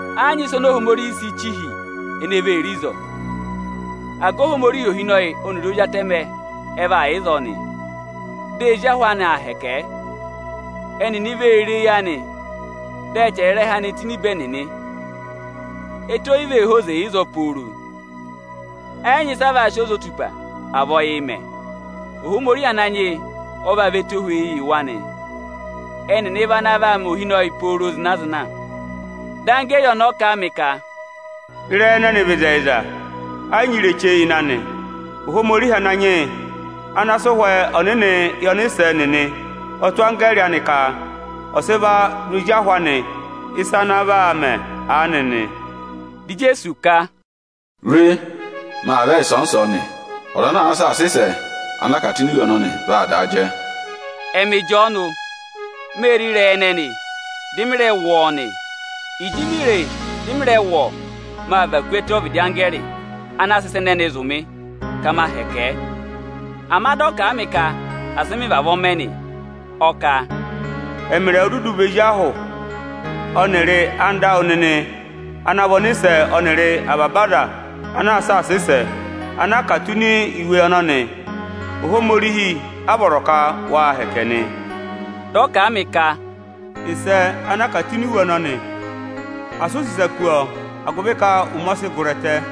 Ẹ yị nyị ịsa oni Ohomorihi si chi hi ene vee re ịzọọ. Aga Ohomorihi ohinọyị ọnịrị Ozi Atẹmẹ ẹ vaa yà ịzọọ nị. Dị ezi ahị anị aa hẹkẹ ẹ. Ẹnịnị vee re eyi anị, dị a chẹrẹ ịrẹha anị tụ́ ini ibe ẹnịnị. Ẹtẹ o yi vee hozi ịzọọ pooro, ẹ yị nyị ịsị ẹ vaa sị ozotupa, à vị ọyịị̄ mẹ. Ohomorihi ọ vaa vị ẹtohweyi yị wa nị. Ẹnịnị vị ana vaa mẹ ohinọyị pooro zịna-zịna. Dị anggẹẹrị ọnọọ kà a mị ka, “Ịrẹyị ẹnẹnị vị ịzẹyịza, ẹ yị nyị ireche ịnị anị. Ohomorihi Ananyị yị ana sị Ụhwẹ Ọnịnị anị yị ọnịsẹ nịnị ọ tụ́ anggẹẹrị anị ka ọ̀ sị va zụ̀ ezi ahụ anị ịsa ana aa vaa mẹ aanị nị.” Di Ijeesu ka, “Re, maa aa vẹ ịsọọnị-ịsọọnị. Ọza ana àa saasa ịsẹ ana a kà tụ́ ini iwe ọnọnị, vaa daa jẹ.” Ẹmị Ịjọọnụ, mê re ịrẹyị ẹnẹnị, dị mị rẹ wụ́ ọọ nị. Ịjị mi re e, dị mị rẹ wụ́ ọọ, mâ và ku ẹtẹ ọvịdị anggẹẹrị ana sị ịsa ẹnẹnị zụ̀ mị ka ma hẹkẹ ẹ. Ama dị ọ kà a yị mị ka asị mị vavọọ mẹ nị. Ọ kà, “Ẹmị rẹ vị ozi ahụ anka ẹwụ, ne beri ọnịsẹ nịnị ọnịrị avaba aza anaa saasa ịsa ana a kà tụ́ ini iwe ọnọnị. Ohomorihi kẹnẹ a vọrọ ka ya hẹkẹ nị.” Dị ọ kà a mị ka, “Àsị u sị ịsa kú ịrẹyị ịsẹ ana a kà tụ́ ini iwe ọnọnị, agụvị ka ụmẹ ọ sị gụrị ẹtẹ.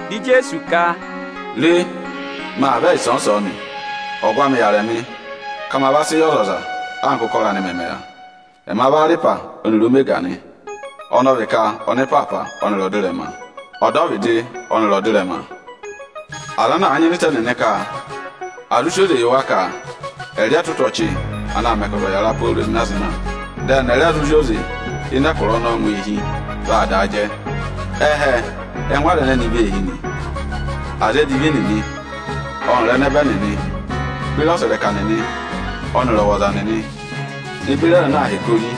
Di Ijeesu ka, Re, ọnị aa vẹ ịsọọnị-ịsọọnị. Ọgụ anị yàrị ọnị ka ọnị ọ̀ va sị yị ọzọza, anka ụkọrọ ọzọza mẹ̀ yà. Ọnị ọ vị Arịhwa ọnịrị Omega nị, ọnị ọ vị ka ọnịpaapa ọnịrị ọdịrẹma, ọdọvịdị ọnịrị ọdịrẹma. Aza ana àa nyịna ịta ẹnịnị nị, agụvị à zụ sị oze yị ẹnị ka ẹnị ẹ̀ zụ rị ẹtụtụ ọchị anaā mẹ ka ọza ọ̀ yàra pooro zịna-zịna, dị ẹnị ẹ̀ rẹ zụ zị oze ịnị ẹkụra ọnọọ ngụ eehi, vaa daa jẹ. Eyi ẹhẹ ẹ́ngụ aza ẹnẹnị vee hi nị: aza edivi nịnị ọnịrị ẹnẹbẹ nịnị beri ọsẹrẹka nịnị ọnịrị ọwọza nịnị ne beri aza ana aa hẹkẹ ori,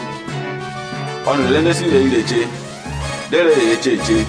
ọnịrị aza ene sì ịrẹyị ireche, di e re yee cheeche.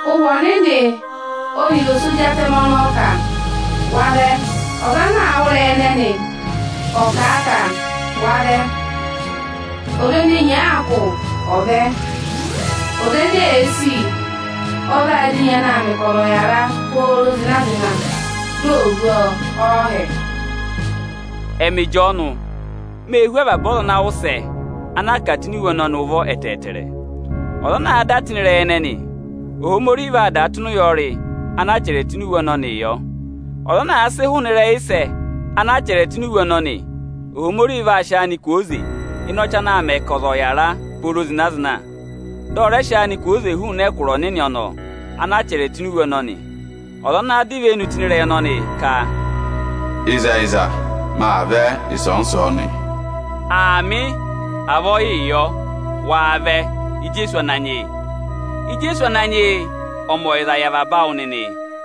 Ụhwẹ Ohomorihi ọnịrị ose Ozi Atẹmẹ ọnọọ ka: wa vẹ! Ọza ana àa wụ́ ịrẹyị ẹnẹnị, ọ̀ kà a ka: Wa vẹ! Ọza ene enyi àa kụ̀, ọ̀ vẹ! Ọza ene èe sì, ọ̀ va dọ enyi anaā mẹ ka ọza ọ̀ yàra pooro zịna-zịna, di ò hú ọọ ọọhẹ! Ẹmị Ịjọọnụ, mee hú avaba aza ana aa wụ́ ịsẹ ana a kà tụ́ ini iwe ọnọnị ụvọ ẹtẹẹtẹrẹ; ọza ana àa da tụ́ ịnị ịrẹyị ẹnẹnị, Ohomorihi vaa dà tụ́ ịnị ụyọrị ana achẹrẹ tụ́ ini iwe ọnọnịị yọ. Ọza ana àa sị hụụnị ịrẹyị ịsẹ ana a chẹrẹ tụ́ ini iwe ọnọnị, Ohomorihi vaa sị áanịị kwooze hụụnị ịnị ọchị anaā mẹ ka ọza ọ̀ yàra pooro zịna-zịna, dị ọ rẹ sị áanị kwooze hụụnị ẹkụra Ohomorihi ọnọọ ana a chẹrẹ tụ́ ini iwe ọnọnị. Ọza ana dọ ivenu tụ́ ịnị ịrẹyị ọnọnị ka: Ịzẹyịza, ọnị aa vẹ ịsọọnị-ịsọọnị! Aamị; avọọ yịị yọ! Wa vẹ, Ijeesu Ananyị yị! Ijeesu Ananyị yị ọ̀ mẹ ọyịza yị avaba awụ nịnị!